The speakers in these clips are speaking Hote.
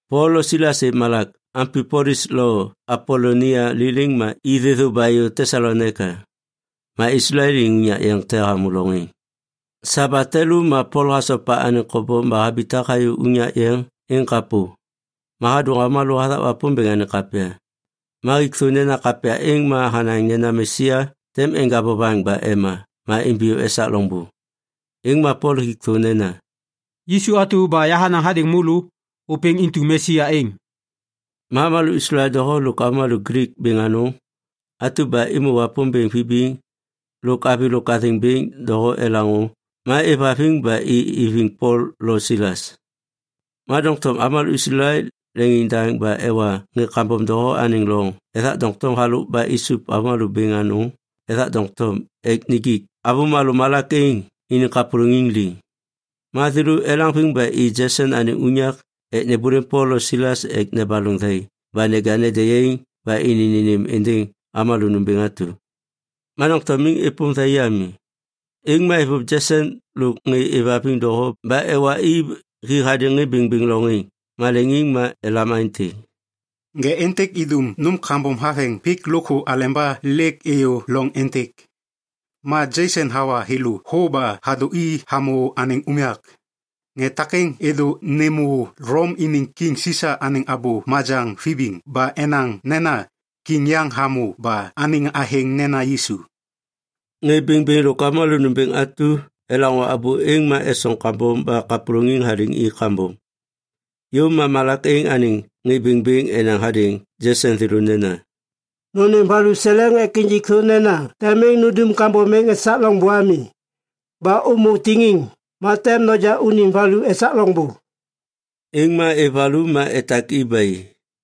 Pol lo Silas êv malak Ampipolis lo Apolonia liliŋ ma i thêthô ba êyô Tesalonaika. Ma Islael iniŋ unyak yeŋ te hamô loŋ êŋ. Sabat te lô ma Pol hasopa anêŋ kobom ba habitak hayô unyak yeŋ êŋ kapô. Ma hadôŋ avômalô hathak Wapômbêŋ anêŋ kapya. Ma hik thô nena kapya êŋ ma hanaŋ nena Mesia tem enja vovaŋ ba ema ma imbiyô esak loŋbô. Êŋ ma Pol hik thô nena, “Yisu atu ba yahanaŋ hadêŋ môlô, ôpêŋ intu Mesia êŋ.” Ma avômalô Islael doho lôk avômalô Glik bêŋ anôŋ atu ba êmô Wapômbêŋ vibiŋ lôk avi lôk athêŋ bêŋ doho elaŋô ma êvhaviŋ ba i iviŋ Pol lo Silas. Ma doŋtom avômalô Islael leŋiŋdaŋ ba ewa ŋê kambom doho anêŋ loŋ ethak doŋtom halôk ba isup avômalô bêŋ anôŋ ethak doŋtom ek nijik avômalô malak êŋ iniŋ kapôlôŋiŋ liŋ. Ma thêlô elaŋviŋ ba i Jeson anêŋ unyak ek nêmbôlêm Pol lo Silas ek nebaloŋ thai ba neja ende yaiŋ ba ini nênêm êndêŋ avômalô nômbêŋ atu. Ma doŋtom miŋ êpôm thai ami, êŋ ma êvôv Jeson lôk ŋê êvhaviŋ doho ba ewa i hi hadêŋ ŋê bêŋbêŋ loŋ êŋ maleŋiŋ ma elam aêntêk, “Ŋê êntêk êŋ idum nôm kambom haveŋ pik lôkthô aleba lêk êyô loŋ êntêk. Ma Jeson hawa thêlô thô ba hadô i hamô anêŋ unyak. Ŋê takêŋ êdô nêmô Lom iniŋ Kiŋ Sisa anêŋ abô majaŋ vibiŋ ba enaŋ nena, ‘Kiŋ yaŋ hamô ba anêŋ athêŋ nena Yisu.’” Ŋê bêŋbêŋ lôk avômalô nômbêŋ atu elaŋô abô êŋ ma esoŋ kambom ba kapôlôŋiŋ haliŋ i kambom. Yôv ma malak êŋ anêŋ ŋê bêŋbêŋ enaŋ hadêŋ Jeson thêlô nena, “Nônêm valuseleŋ ek injik thô nena tem miŋ nundum kambom êŋ esak loŋbô ami. Ba ômô tiŋiŋ, ma tem noja unim valu esak loŋbô.” Êŋ ma êv valu ma etak i ba i.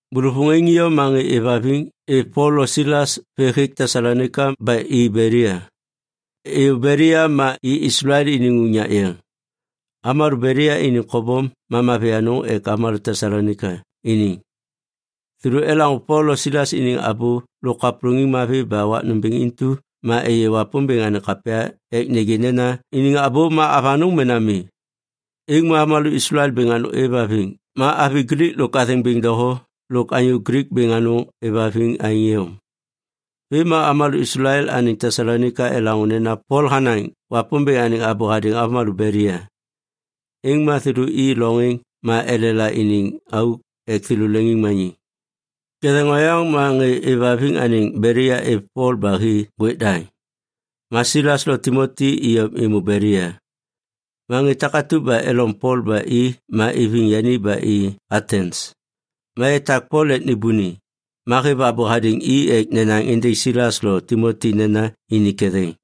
Bôlôvôŋ êŋ iyom ma ŋê êvhaviŋ êv Pol lo Silas vê hêk Tesalonaika ba i Belia. Êyô Belia ma i Islael iniŋ unyak yeŋ. Avômalô Belia iniŋ kobom ma mavi anôŋ ek avômalô Tesalonaika iniŋ. Thêlô elaŋô Pol lo Silas iniŋ abô lôk kapôlôŋiŋ mavi ba wak nômbêŋ intu ma êyê Wapômbêŋ anêŋ kapya ek nêgê nena iniŋ abô ma avanôŋ mena mi. Êŋ ma avômalô Islael bêŋ anôŋ êvhaviŋ ma avi Glik lôk athêŋ bêŋ doho lôk anyô Glik bêŋ anôŋ êvhaviŋ aêŋ iyom. Vêm ma avômalô Islael anêŋ Tesalonaika elaŋô nena Pol hanaŋ Wapômbêŋ anêŋ abô hadêŋ avômalô Belia. Êŋ ma thêlô i loŋ êŋ ma elela iniŋ auk ek thêlô leŋiŋmaniŋ. Ketheŋ oyaŋ ma ŋê êvhaviŋ anêŋ Belia êv Pol ba hi ŋgwêk daŋ, ma Silas lo Timoti iyom êmô Belia. Ma ŋê takatu ba elom Pol ba i ma iviŋ yani ba i Atens. Ma etak Pol ek nêbôni, ma hêv abô hadêŋ i ek nenaŋ êndêŋ Silas lo Timoti nena ini ketheŋ.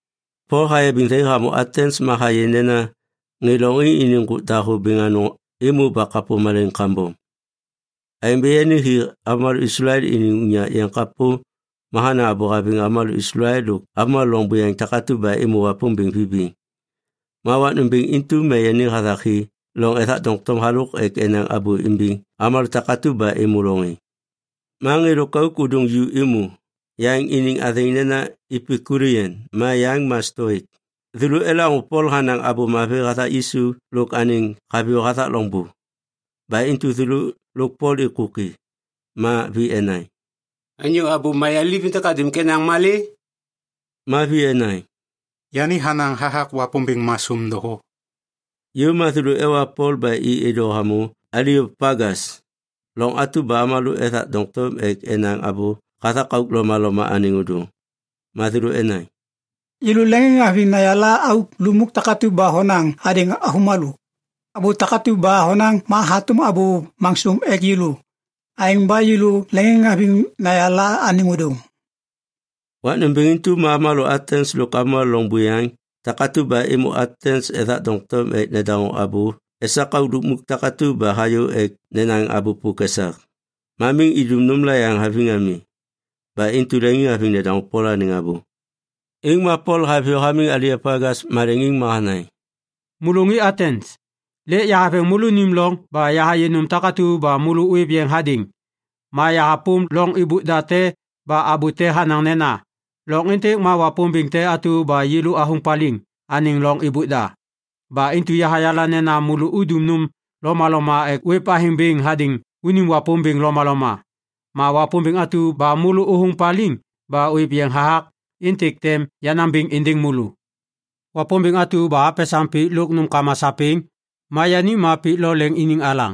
Pol hayabiŋ thai hamô Atens ma hayê nena ŋê lôŋ êŋ iniŋ ŋgôk dahô bêŋ anôŋ êmô ba kapô malaiŋ kambom. Aêŋ ba yani hi avômalô Islael iniŋ unyak yeŋ kapô ma hanaŋ abô haviŋ avômalô Islael lôk avômalô loŋ buyaŋ takatu ba êmô Wapômbêŋ vibiŋ. Ma wak nômbêŋ intu ma yani hathak hi loŋ ethak doŋtom halôk ek enaŋ abô imbiŋ avômalô takatu ba êmô loŋ êŋ. Ma ŋê lôkauk ôdôŋ ju êmô, yaŋ iniŋ athêŋ nena Epikulian ma yaŋ ma Stoik. Thêlô elaŋô Pol hanaŋ Abô Mavi hathak Yisu lôk anêŋ haviyô hathak loŋbô. Ba intu thêlô lôk Pol êkôki. Ma vi enaŋ, “Anyô abô mayaliv êntêk hadum ek enaŋ malê?” Ma vi enaŋ, “Yani hanaŋ hathak wapômbêŋ masôm doho.” Yôv ma thêlô ewa Pol ba i êdô hamô Aliopagas, loŋ atu ba avômalô ethak doŋtom ek enaŋ abô hathak auk lomaloma anêŋ ôdôŋ. Ma thêlô enaŋ, “Yêlô leŋiŋhaviŋ nayala auk lukmuk takatu ba honaŋ hadêŋ avômalô. Abô takatu ba honaŋ ma hatôm abô masôm ek yêlô. Aêŋ ba yêlô leŋiŋhaviŋ nayala anêŋ ôdôŋ.” Wak nômbêŋ intu ma avômalô Atens lôk avômalô loŋ buyaŋ takatu ba êmô Atens ethak doŋtom ek nedaŋô abô esak auk lukmuk takatu ba hayô ek nenaŋ abô pôk esak. Ma miŋ idum nômla yaŋ haviŋ ami. Ba intu leŋiŋhaviŋ nedaŋô Pol anêŋ abô. Êŋ ma Pol haviyô hamiŋ Aliopagas maleŋiŋ ma hanaŋ, “Môlô ŋê Atens, lêk yahaveŋ môlônim loŋ ba yahayê nôm takatu ba môlô ôêv yeŋ hadêŋ. Ma yahapôm loŋ êbôk da te ba abô te hanaŋ nena, ‘Loŋ êntêk ma wapômbêŋ te atu ba yêlô athôŋ paliŋ anêŋ loŋ êbôk da.’ Ba intu yahayala nena môlô udum nôm lomaloma ek ôêv athêŋ bêŋ hadêŋ unim wapômbêŋ lomaloma. Ma wapômbêŋ atu ba môlô ôthôŋ paliŋ ba ôêv yeŋ hathak, êntêk tem yanaŋ bêŋ êndêŋ môlô. “Wapômbêŋ atu ba hapesaŋ pik lôk anêŋ nômkama sapêŋ, ma yani ma pik lo leŋ iniŋ alaŋ.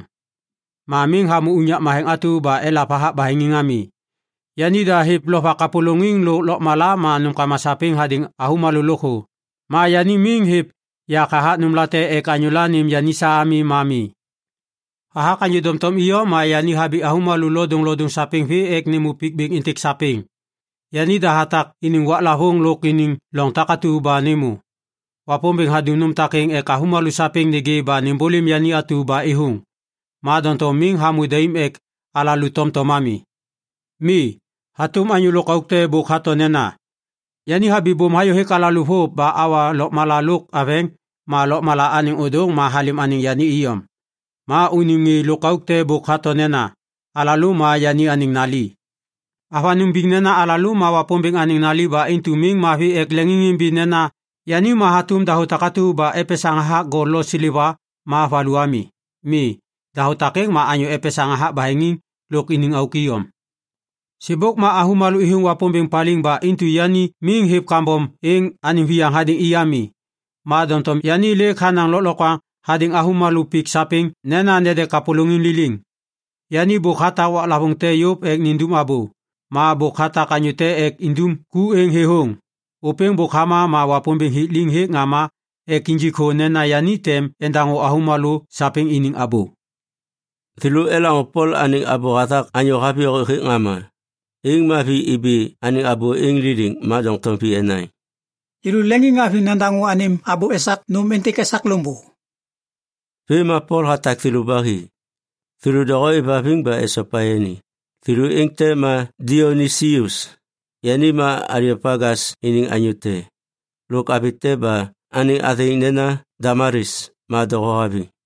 Ma miŋ hamô unyak matheŋ atu ba elav hathak baheŋiŋ ami. Yanida hêv lovak kapôlôŋiŋ lôk lôkmala ma nômkama sapêŋ hadêŋ avômalô lôkthô. Ma yani miŋ hêv yak hathak nômlate ek anyôla nêm yani sa ami, ma mi. Hathak anyô doŋtom iyom ma yani habi avômalô lodôŋlodôŋ sapêŋ vê ek nêmô pik bêŋ êntêk sapêŋ. Yanida hatak iniŋ waklavôŋ lôk iniŋ loŋ takatu ba nêmô. Wapômbêŋ hadum nôm takêŋ ek avômalô sapêŋ nêgê ba nêmbôlêm yani atu ba êthôŋ. Ma doŋtom miŋ hamô daim ek alalô tomtom ami. “Mi, hatôm anyô lôkauk te bôk hato nena, ‘Yani habibôm hayô hêk alalô vôv ba awa lôkmala lôk aveŋ ma lôkmala anêŋ ôdôŋ ma halêm anêŋ yani iyom.’ Ma unim ŋê lôkauk te bôk hato nena, ‘Alalô ma yani anêŋ nali.’ “Avanôŋ biŋ nena alalô ma Wapômbêŋ anêŋ nali ba intu miŋ mavi ek leŋiŋimbi nena yani ma hatôm dahô takatu ba epesaŋ hathak gol lo seleva ma valu ami. Mi, dahô takêŋ ma anyô epesaŋ hathak baheŋiŋ lôk iniŋ auk iyom. Sêbôk ma avômalô êthôŋ Wapômbêŋ paliŋ ba intu yani miŋ hêv kambom êŋ anêŋ viyaŋ hadêŋ i ami. Ma doŋtom yani lêk hanaŋ lôklokwaŋ hadêŋ avômalô pik sapêŋ nena nede kapôlôŋiŋ liliŋ. Yani bôk hatak waklavôŋ te yôv ek nindum abô. Ma bôk hatak anyô te ek indum ku êŋ thêthôŋ. Ôpêŋ bôk hama ma Wapômbêŋ hik liŋ hêk ŋama ek injik thô nena yani tem endaŋô avômalô sapêŋ iniŋ abô.” Thêlô elaŋô Pol anêŋ abô hathak anyô haviyô hêk ŋama, êŋ ma vi ibi anêŋ abô êŋ liliŋ ma doŋtom vi enaŋ, “Yêlô leŋiŋhaviŋ nadaŋô anêm abô esak nôm êntêk esak loŋbô.” Vêm ma Pol hatak thêlô ba hi. Thêlô doho êvhaviŋ ba esopa yani. Thêlô êŋ te ma Dionisius, yani ma Aliopagas iniŋ anyô te, lôk avi te ba anêŋ athêŋ nena Damalis, ma doho haviŋ.